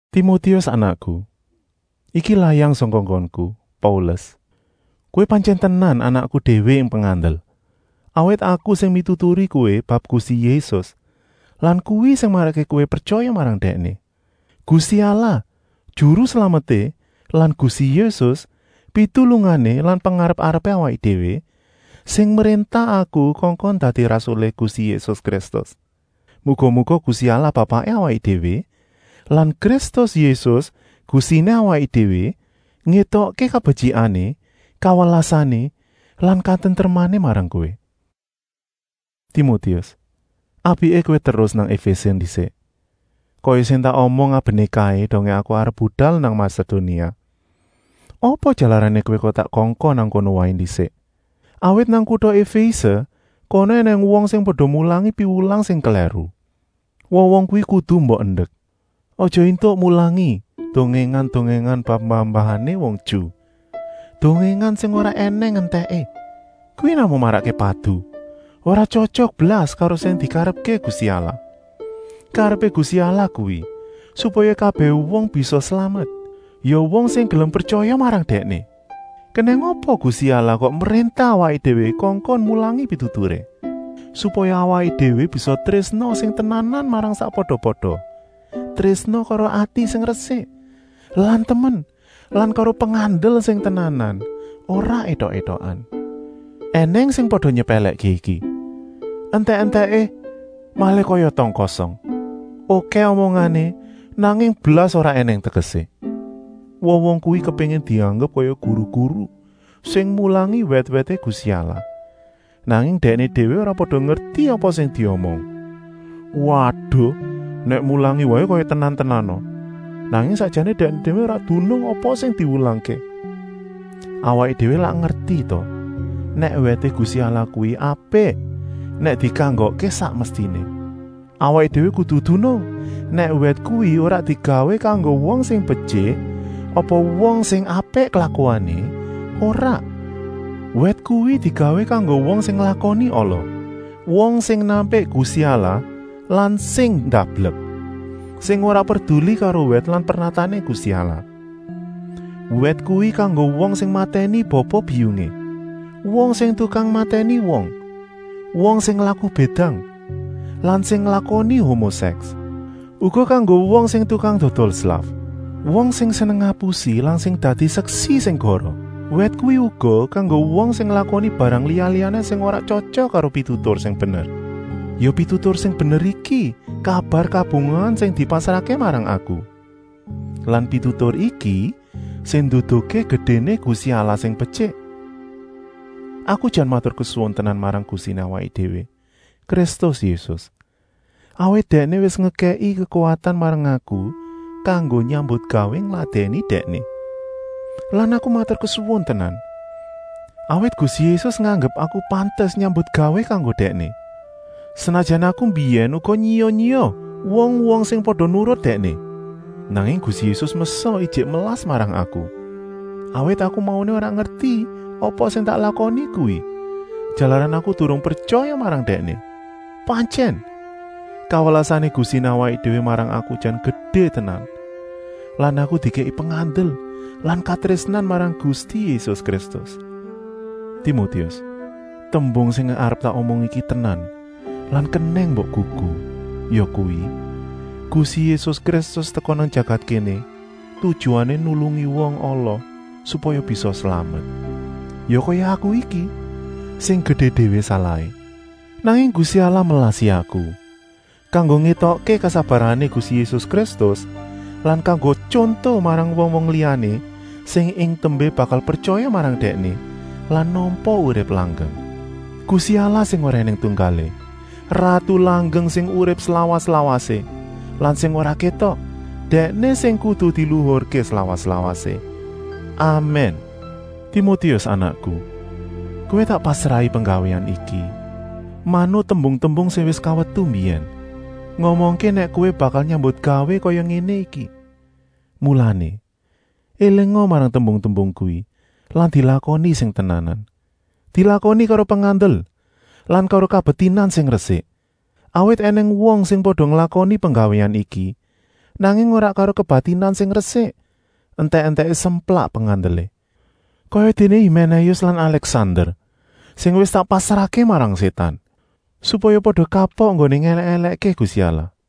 Timotius anakku, iki layang sangka nggonku, Paulus. Kowé pantyèn tenan anakku déwé ing pengandel, awit aku sing mituturi kowé bab Gusti Yésus lan kuwi sing marakké kowé pretyaya marang Dèkné. Gusti Allah, Juru Slameté lan Gusti Yésus, pitulungané lan pengarep-arepé awaké déwé, sing mréntah aku kongkon dadi rasulé Gusti Yésus Kristus. Muga-muga Gusti Allah Bapaké awaké déwé lan Kristus Yésus Gustiné awaké déwé, ngétokké kabetyikané, kawelasané lan katentremané marang kowé. Timotius, apiké kowé terus nang Efése ndisik, kaya sing tak omong abené kaé dongé aku arep budal nang Masedonia. Apa jalarané kowé kok tak kongkon nang kono waé ndisik? Awit nang kuta Efése kono ènèng wong sing pada mulangi piwulang sing klèru. Wong-wong kuwi kudu mbok endek. Aja éntuk mulangi dongèngan-dongèngan bab mbah-mbahané wong Ju, dongèngan sing ora ènèng entèké. Kuwi namung marakké padu, ora tyotyok blas karo sing dikarepké Gusti Allah. Karepé Gusti Allah kuwi, supaya kabèh wong bisa slamet, ya wong sing gelem pretyaya marang Dèkné. Kenèng apa Gusti Allah kok mréntah awaké déwé kongkon mulangi pituturé? Supaya awaké déwé bisa trésna sing tenanan marang sakpada-pada, trésna karo ati sing resik lan temen lan karo pengandel sing tenanan, ora étok-étokan. Enèng sing pada nyepèlèkké iki, entèk-entèké malih kaya tong kosong: okèh omongané, nanging blas ora ènèng tegesé. Wong-wong kuwi kepéngin dianggep kaya guru-guru sing mulangi wèt-wèté Gusti Allah, nanging dèkné déwé ora pada ngerti apa sing diomong. Waduh, nèk mulangi waé kaya tenan-tenana, nanging sakjané dèkné déwé ora dunung apa sing diwulangké. Awaké déwé lak ngerti ta nèk wèté Gusti Allah kuwi apik nèk dikanggokké sak mestiné. Awaké déwé kudu dunung nèk wèt kuwi ora digawé kanggo wong sing betyik apa wong sing apik klakuané, ora! Wèt kuwi digawé kanggo wong sing nglakoni ala, wong sing nampik Gusti Allah lan sing ndablek, sing ora perduli karo wèt lan pernatané Gusti Allah. Wèt kuwi kanggo wong sing matèni bapa-biyungé, wong sing tukang matèni wong, wong sing laku bédang lan sing nglakoni homo-sèks. Uga kanggo wong sing tukang dodol slaf, wong sing seneng ngapusi lan sing dadi seksi sing goroh. Wèt kuwi uga kanggo wong sing nglakoni barang liya-liyané sing ora tyotyok karo pitutur sing bener. Ya pitutur sing bener iki kabar kabungahan sing dipasrahké marang aku. Lan pitutur iki sing nduduhké gedéné Gusti Allah sing betyik. Aku jan maturkesuwun tenan marang Gustiné awaké déwé, Kristus Yésus. Awit Dèkné wis ngekèki kekuwatan marang aku kanggo nyambutgawé ngladèni Dèkné. Lan aku maturkesuwun tenan, awit Gusti Yésus nganggep aku pantes nyambutgawé kanggo Dèkné, senajan aku mbiyèn uga nyiya-nyiya wong-wong sing pada nurut Dèkné. Nanging Gusti Yésus meksa ijik melas marang aku, awit aku mauné ora ngerti apa sing tak lakoni kuwi, jalaran aku durung pretyaya marang Dèkné. Pantyèn, kawelasané Gustiné awaké déwé marang aku jan gedé tenan lan aku dikèki pengandel lan katrésnan marang Gusti Yésus Kristus. Timotius, tembung sing arep tak omong iki tenan lan kenèng mbok gugu, yakuwi, Gusti Yésus Kristus teka nang jagat kéné tujuané nulungi wong ala supaya bisa slamet. Ya kaya aku iki, sing gedé déwé salahé. Nanging Gusti Allah melasi aku, kanggo ngétokké kesabarané Gusti Yésus Kristus lan kanggo tyonto marang wong-wong liyané sing ing tembé bakal pretyaya marang Dèkné lan nampa urip langgeng. Gusti Allah sing ora ènèng tunggalé, ratu langgeng sing urip slawas-lawasé lan sing ora kétok, Dèkné sing kudu diluhurké slawas-lawasé. Amèn. Timotius anakku, kowé tak pasrahi penggawéan iki, manut tembung-tembung sing wis kawetu mbiyèn, ngomongké nèk kowé bakal nyambutgawé kaya ngéné iki. Mulané, élinga marang tembung-tembung kuwi lan dilakoni sing tenanan. Dilakoni karo pengandel lan karo kebatinan sing resik. Awit ènèng wong sing pada nglakoni penggawéan iki, nanging ora karo kebatinan sing resik, entèk-entèké semplak pengandelé. Kayadéné Himénéus lan Alèksander, sing wis tak pasrahké marang Sétan, supaya pada kapok enggoné ngèlèk-èlèkké Gusti Allah.